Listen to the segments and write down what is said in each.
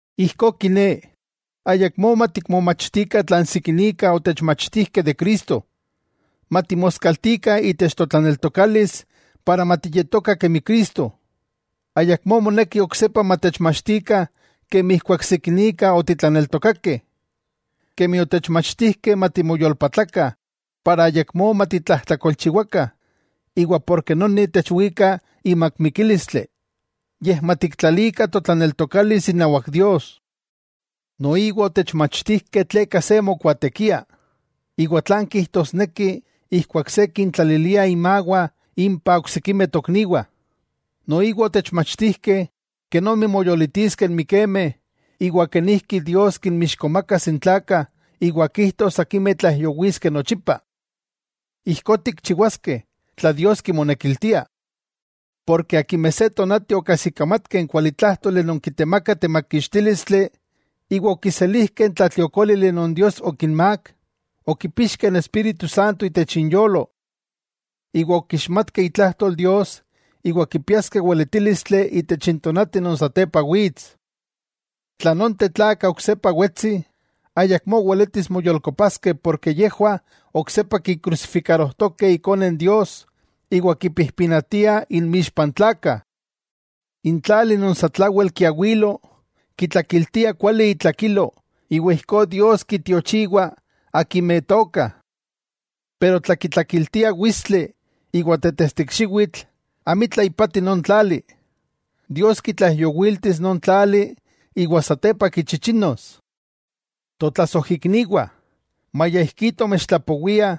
Ijkó kiné, ayakmó matikmomachtikah tlan sikinika otechmachtijkeh de Cristo, matimoskaltikah itech totlaneltokalis iwa matiyetokah kemi Cristo. Ayakmó moneki oksepa matechmachtikah kemi ijkuak sikinika otitlaneltokakeh. Kemi otechmachtijkeh matimoyolpatlakah para ayakmó matitlajtlakolchiwakah iwa porke noni techwika imak mikílistli, yej matiktlalikah totlaneltokalis inawak Dios. Noiwa otechmachtijkeh tleka se mokuaatekia, iwa tlan kijtosneki ijkuak se kintlalilia inmawah impa oksikimeh tokniwah, noiwa otechmachtijkeh kenomi moyolitiskeh n mikemeh iwa kenijki Dios kinmixkomakas n tlakah iwa kijtos akimeh tlaijyowiskeh nochipa. Ijkó tikchiwaskeh, tla Dios kimonekiltia. Akimeh se tonati okajsikamatkeh n kuali tlájtoli non kitemakah temakixtílistli, iwa okiselijkeh n tlatliokólili non Dios okinmák, okipixkeh n Espíritu Santo itech inyolo iwa okixmatkeh itlajtol Dios iwa kipiaskeh weletílistli itech n tonati non satepa wits, tla nonteh tlakah oksepa wetsi, ayakmó weletis moyolkopaskeh porke yejwah oksepa kikrusifikarojtokeh Ikone Dios iwa kipijpinatia inmixpa n tlakah. N tlali non satlawel kiawilo kitlakiltia kuali itlakilo iwa ijkó Dios kintiochiwa akimeh tookah. Pero tla kitlakiltia witstli iwa tetestikxiwitl, amitla ipati non tlali, Dios kitlaijyowiltis non tlali iwa satepa kichichinos. Totlasojikniwah, maya ijkí tomechtlapowiah,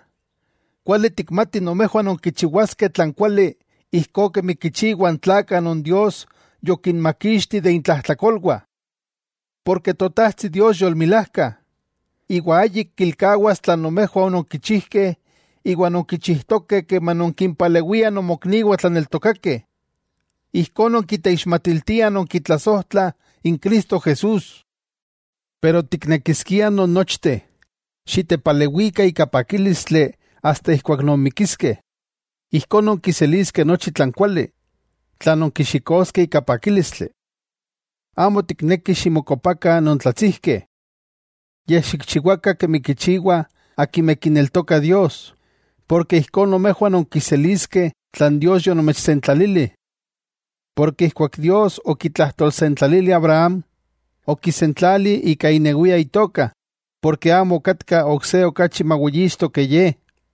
kuali tikmatih nomejwah nonkichiwaskeh tlan kuali ijkó kemi kichiwah n tlakah non Dios yokinmakixti de intlajtlakolwah. Porke Totajtsi Dios yolmilajka, iwa ayik kilkawas tlan nomejwah ononkichijkeh iwa nonkichijtokeh keman nonkimpalewiah nomokniwah tlaneltokakeh. Ijkó nonkiteixmatiltiah nonkitlasojtlah n Cristo Jesús. Pero tiknekiskiah non nochteh xitepalewikah ika pakílistli asta ijkuak nonmikiskeh. Ijkó nonkiseliskeh nochi tlan kuali, tlan nonkichixtokeh ika pakílistli. Amo tiknekih ximokopakah nontlatsijkeh. Yej, xikchiwakah kemi kichiwah akimeh kineltokah Dios, porke ijkó nomejwah nonkiseliskeh tlan Dios yonomechsentlalili. Porke ijkuak Dios okitlajtolsentlalili Abraham, okisentlali ika inewia Itoka, porke amo okatka ok se okachi maweyixto ke Ye,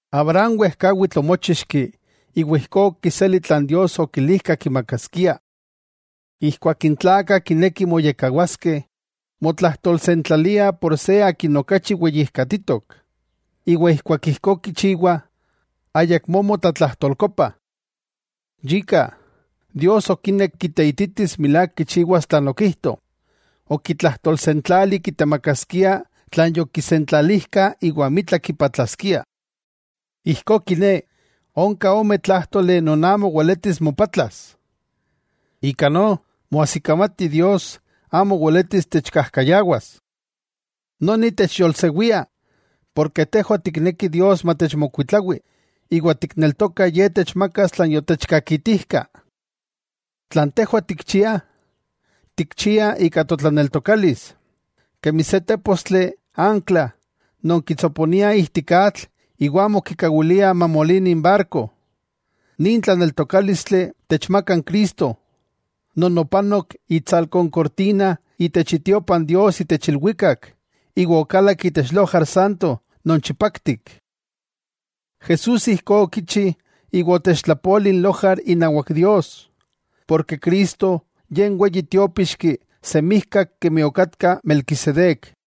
Abraham wejkawitl omochixki iwa ijkó okiseli tlan Dios okilijka kimakaskia. Ijkuak n tlakah kinekih moyekkawaskeh, motlajtolsentlalia por se akin okachi weyijkatitok, iwa ijkuak ijkó kichiwah, ayakmó motlatlajtolkopah. Yika, Dios okinek kiteititis milák kichiwas tlan okijto, okitlajtolsentlali kitemakaskia tlan yokisentlalijka iwa amitla kipatlaskia. Ijkó kiné, onka ome tlájtoli non amo weletis mopatlas. Ika no moajsikamati Dios amo weletis techkajkayawas. Noni techyolsewia, ken tejwah tiknekih Dios matechmokuitlawi, iwa tikneltokah Ye techmakas tlan yotechkakitijka. Tlan tejwah tikchiah, tikchiah ika totlaneltokalis, kemi se tépostli ankla non kitsoponia ijtik atl iwa amo kikawilia mamolini n barko, nin tlaneltokálistli techmakah n Cristo, non opanok itsalko n kortina itech itiopa n Dios itech ilwikak iwa okalak itech lojar santo non chipaktik. Jesús ijkó okichi iwa otechtlapoli n lojar inawak Dios, porke Cristo Ye n Weyi Tiópixki semijkak kemi okatka Melquisedec.